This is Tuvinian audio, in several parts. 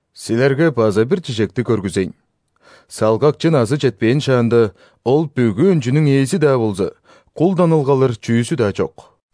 Силерге база бир чижекти көргүзейн: салгакчы назы четпээн шаанда, ол бүгү өнчүнүң ээзи-даа болза, кулдан ылгалыр чүзү-даа чок.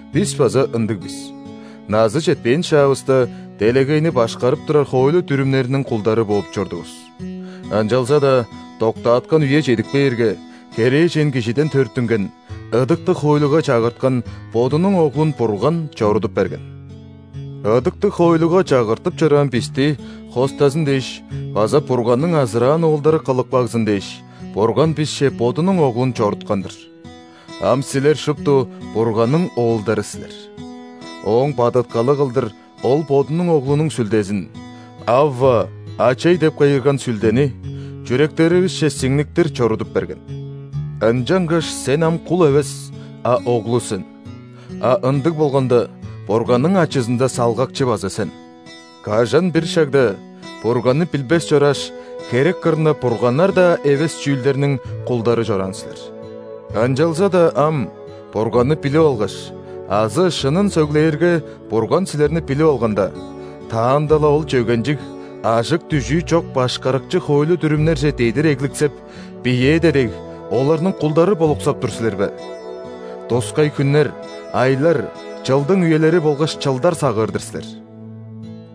Бис база ындыг бис: назы четпээн шаавыста, делегейни башкарып турар хоойлу-дүрүмнериниң кулдары бооп чордувус. Ынчалза-даа доктааткан үе чедип кээрге, херээжен кижиден төрүттүнген, ыдыктыг хоойлуга чагырткан Бодунуң Оглун Бурган чорудуп берген. Ыдыктыг хоойлуга чагыртып чораан бисти хостазын дээш база Бурганның азыраан оолдары кылып кагзын дээш, Бурган бисче Бодунуң Оглун чоруткан-дыр. Ам силер шупту Бурганның оолдары силер! Ооң бадыткалы кылдыр Ол Бодунуң Оглунуң Сүлдезин, «Авва! Ачай!» деп кыйгырган Сүлдени, чүректеривисче сиңниктир чорудуп берген. Ынчангаш сен ам кул эвес, а оглу сен. А ындыг болганда, Бурганның ачызында салгакчы база сен. Кажан-бир шагда, Бурганны билбес чорааш, херек кырында бурганнар-даа эвес чүүлдерниң кулдары чораан силер. Ынчалза-даа ам, Бурганны билип алгаш (азы, шынын сөглээрге, Бурган силерни билип алганда), таанда-ла ол чөгенчиг, ажык-дүжүү чок башкарыкчы хоойлу-дүрүмнерже дедир эгликсеп, биеэде дег, оларның кулдары болуксап тур силер бе? Тускай хүннер, айлар, чылдың үелери болгаш чылдар сагыыр-дыр силер.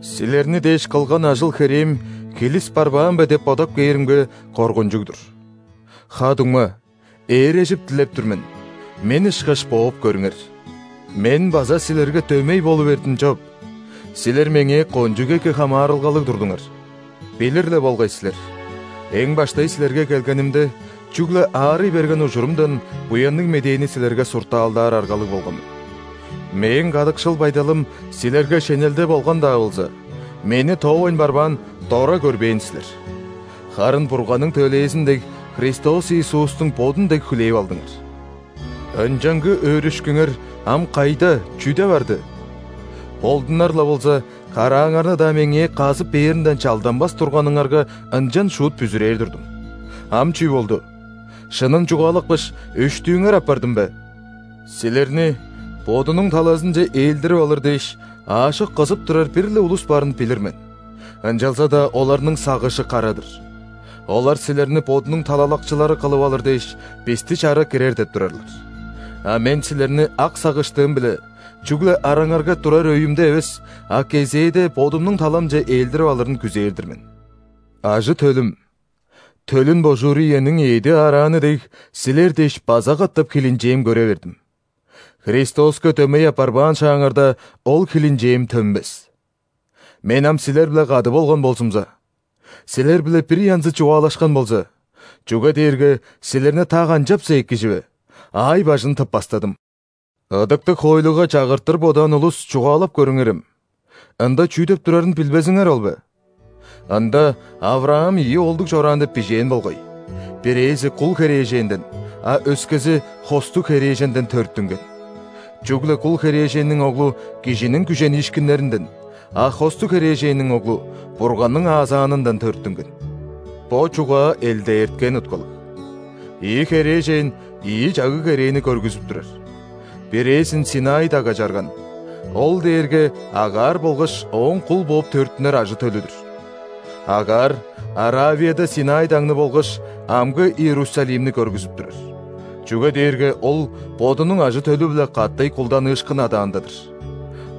Силерни дээш кылган ажыл-херээм хилис барбаан бе деп бодап кээримге, коргунчуг-дур! Ха-дуңма, ээрежип дилеп тур мен: мен ышкаш бооп көрүңер. Мен база силерге дөмей болу бердим чоп. Силер меңээ кончуг эки хамаарылгалыг турдуңар. Билир-ле болгай силер: эң баштай силерге келгенимде, чүгле аарый берген ужурумдан Буянныг Медээни силерге суртаалдаар аргалыг болган мен. Мээң кадыкшыл байдалым силерге шенелде болган-даа болза, мени тоовайн барбаан, дора көрбээн силер. Харын Бурганның төлээзин дег, Христос Иисустуң бодун дег хүлээп алдыңар. Ынчангы өөрүшкүңер ам кайда-чүде барды? Болдунар-ла болза, карааңарны-даа меңээ казып бээринден чалданмас турганыңарга ынчан шуут бүзүрээр турдум. Ам чүү болду? Шынын чугаалапкаш, өштүүңер апардым бе? Силерни бодунуң талазынче ээлдирип алыр дээш, аажок кызып турар бир-ле улус барын билир мен, ынчалза-даа оларның сагыжы кара-дыр. Олар силерни бодунуң талалакчылары кылып алыр дээш, бисти чара кирер деп турарлар. А мен силерни ак сагыштыым-биле, чүгле араңарга турар өйүмде эвес, а кезээде бодумнуң таламче ээлдирип алырын күзээр-дир мен. Ажы-төлүм! Төлүн божуур иениң эъди аарааны дег, силер дээш база катап хилинчээм көре бердим. Христоска дөмей апарбаан шааңарда, ол хилинчээм төнмес. Мен ам силер-биле кады болган болзумза! Силер-биле бир янзы чугаалашкан болза, чүге дээрге силерни та канчапса эки чүве, аай-бажын тыппастадым. Ыдыктыг хоойлуга чагыртыр бодаан улус, чугаалап көрүңерем: ында чүү деп турарын билбезиңер ол бе? Ында ·Авраам ийи оолдуг чораан деп бижээн болгай: бирээзи – кул херээженден, а өскези – хостуг херээженден төрүттүнген. Чүгле кул херээженниң оглу – кижиниң күжениишкиннеринден, а хостуг херээженниң оглу – Бурганның аазаанындан төрүттүнген. Бо чугаа элдээрткен уткалыг: ийи херээжен ийи чагыг-керээни көргүзүп турар. Бирээзин ·Синай дагга чарган, ол дээрге Агар болгаш ооң кул бооп төрүттүнер ажы-төлү-дүр. Агар Аравияда Синай дагны болгаш амгы Иерусалимни көргүзүп турар, чүге дээрге ол бодунуң ажы-төлү-биле катай кулданыышкын адаанда-дыр.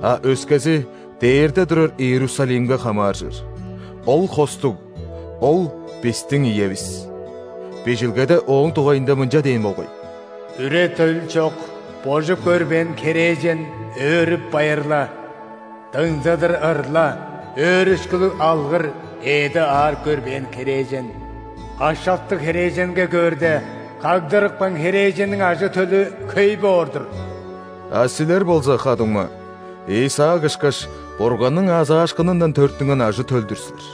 А өскези дээрде турар Иерусалимге хамааржыр, ол – хостуг, ол – бистиң иевис! Бижилгеде ооң дугайында мынча дээн болгай:«Үре-төл чок, божуп көрбээн херээжен, өөрүп-байырла!Дыңзыдыр ырла, өөрүшкүлүг алгыр, эъди аарып көрбээн херээжен!Ашактыг херээженге көөрде, кагдырыпкан херээженниң ажы-төлү хөй боор-дур!» А силер болза, ха-дуңма, Исаак ышкаш, Бурганның аазаашкынындан төрүттүнген ажы-төл-дүр силер.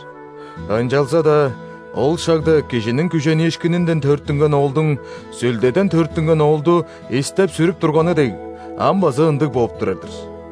Ынчалза-даа ол шагда кижиниң күженииишкининден төрүттүнген оолдуң Сүлдеден төрүттүнген оолду истеп-сүрүп турганы дег, ам база ындыг бооп турар-дыр.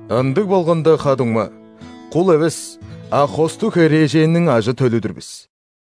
Ындыг болганда, ха-дуңма, кул эвес, а хостуг херээженниң ажы-төлү-дүр бис!